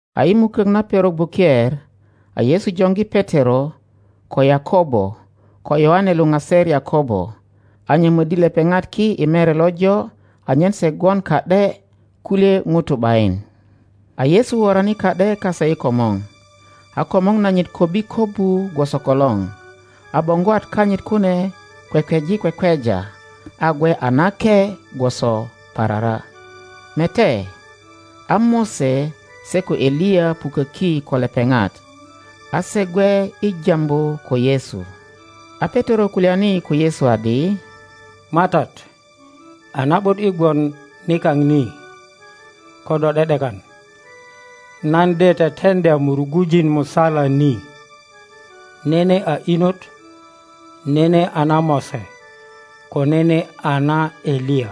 A i mukök na perok buker a Yesu joŋgi Petero, ko Yakobo, ko Yoane luŋaser Yakobo, a nyömöddi lepeŋat ki i mere lojo anyen se gwon ka ’de kulye ŋutu ’bayin. a Yesu worani ka ’de kase i komor, a komor nanyit kobbi kobbu gwoso kolor, a boŋgwat kanyit kune kwekweji kwekweja, a gwe a nake gwoso parara. Mete, a Mose se ko Eliya puköki ko lepeŋat; a se gwe i Tambu ko Yesu. A Petero kulyani ko Yesu adi, MATAT, a na ’but i gwon nikao ni; ko do ’de ’dekan, nan de teteŋdya murugujin musala ni, nene a inot, nene a na Mose, ko nenea na Eliya.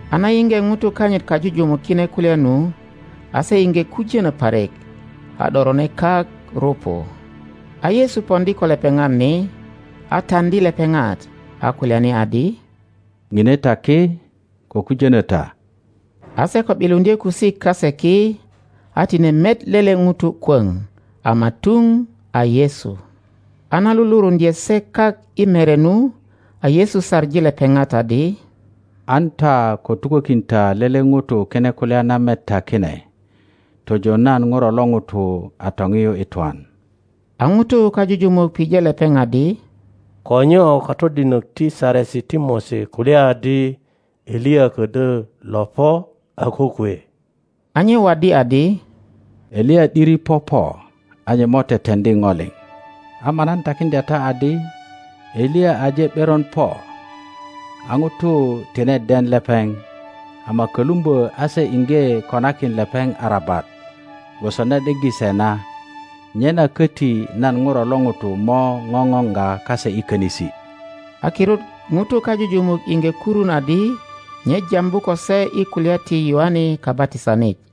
A na yiŋge ŋutu kanyit kajujumuk kine kulya nu, a se iŋge kujöno parik, a ’dorone kak rupu. A Yesu poŋdi ko lepepat ni, a taŋdi lepeŋat, a kulyani adi, ŋine ta ki, ko kujonö ta. A se ko ’biluŋdye kusik kase ki a tine met lele ŋuto kwöŋ ama tuŋ a Yesu. A na luluruŋdye se kak i mere nu, a Yesu saŋi lepeŋat adi, An ta ko tukökin ta lele ŋuto kine kulya na met ta kine tojo nan Ŋuro lo ŋuto a toŋiyu i twan. A ŋutu kajujumuk pije lepeŋ adi, Ko nyo katodinok ti Saresi ti Mose kulya adi Eliya ködyö lo po a kokwe? A nye waddi adi, Eliya ’diri popo, a nye mo teteŋdi go liŋ. Ama nan takiŋdya ta adi, Eliya aje ’beron po a ŋutu tine den lepeŋ, ama kölumbö a se iŋge konakin lepeŋ arabat gwoso na ’deggi se na. Nyena köti nan Ŋuro lo ŋuto mo ŋoŋoŋga kase i könisi. a kirut ŋutu kajujumuk iŋge kurun adi nye jambu ko se i kulya ti Yoane Kabatisanit.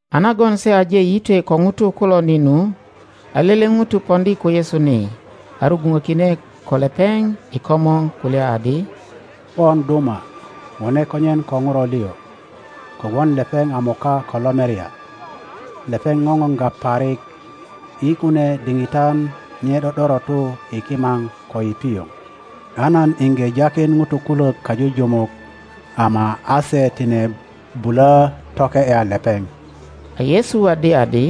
A nagon se aje yitwe ko ŋutu kulo ni nu, a lele ŋuto poŋdi ko Yesu ni, a rugwuŋökine ko lepeŋ i komor, kulya adi, Pon duma, wone konyen ko ŋuro liŋ, kogwon lepeŋ a moka ko lomerya, lepeŋ ŋoŋoga parik; i kunie diŋitan nye ’do ’dorotu i kimaŋ ko i pioŋ. A nan iŋge jakin ŋutu kulök kajujumuk, ama a se tine bulö toke ’ya lepeŋ. A Yesu waddi adi,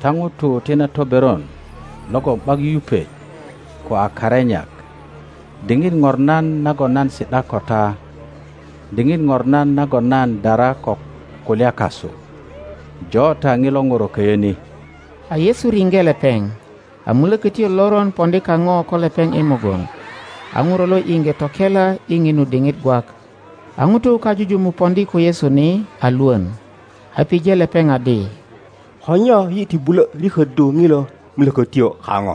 Ta ŋutu ti na toberon logon ’bak yupet ko a karenyak, diŋit ŋornan nagon nan si ’da ko ta? Diŋit ŋornan nagon nan dara ko kulya kasu? Jo ta ŋilo ŋuro köyö ni. A Yesu riŋge lepeŋ, a mulökötyo loron poŋdi kaŋo ko lepeŋ i mugun, a ŋuro lo iŋge tokela i ŋinu diŋit gwak. A ŋutu kajujumuk poŋdi ko Yesu ni a lwön, a pije lepeŋ adi, Ko nyo yi ti bulö riköddu ŋilo mulökötyo kaŋo?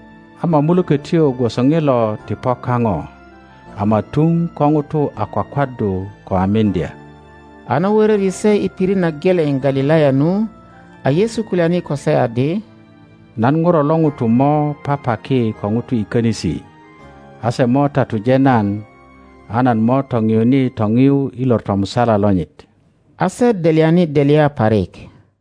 Ama mulökötyo gwoso ŋilo ti po kaŋo, ama tuŋ ko ŋutu a kwakwaddu ko a miŋdya.] A na wöröri se i pirit na geleŋ Galilaya nu, a Yesu kulyani ko se adi, Nan Ŋuro lo ŋuto mo papaki ko ŋutu i könisi, a se mo tatuje nan, a nan mo toŋiyuni toŋiyu i lor tomusala lonyit. A se delyani delya parik.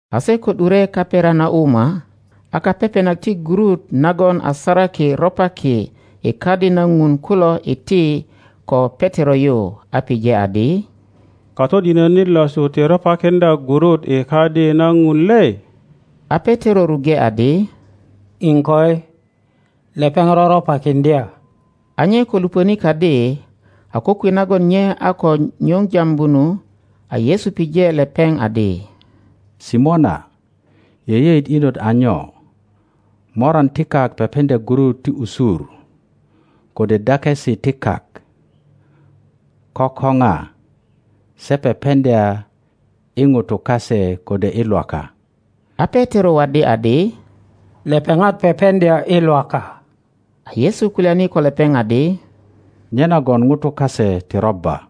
A se ko ’dure Kaperanauma, a kapepenak ti gurut nagon a saraki ropaki i Kadi na ŋun kulo iti ko Petero yu, a pije adi, Katodinönit losu ti ropakiŋdya gurut i Kadi na Ŋun le? A Petero ruŋge adi, iŋkoi, lepeŋ roropakiŋdya. A nye ko lupöni kadi, a kokwe nagon nye a ko nyuŋ jambu nu, a Yesu pije lepeŋ adi. Simona, yeyeet inot a nyo? Moran ti kak pepeŋdya gurut ti usur kode dakesi ti kak ko ko ŋa? Se pepeŋdya i ŋutu kase kode i Lwaka? A Petero waddi adi, Lepeŋat pepeŋdya i Lwaka. A Yesu kulyani ko lepeŋ adi, Nyenagon ŋutu kase ti robba.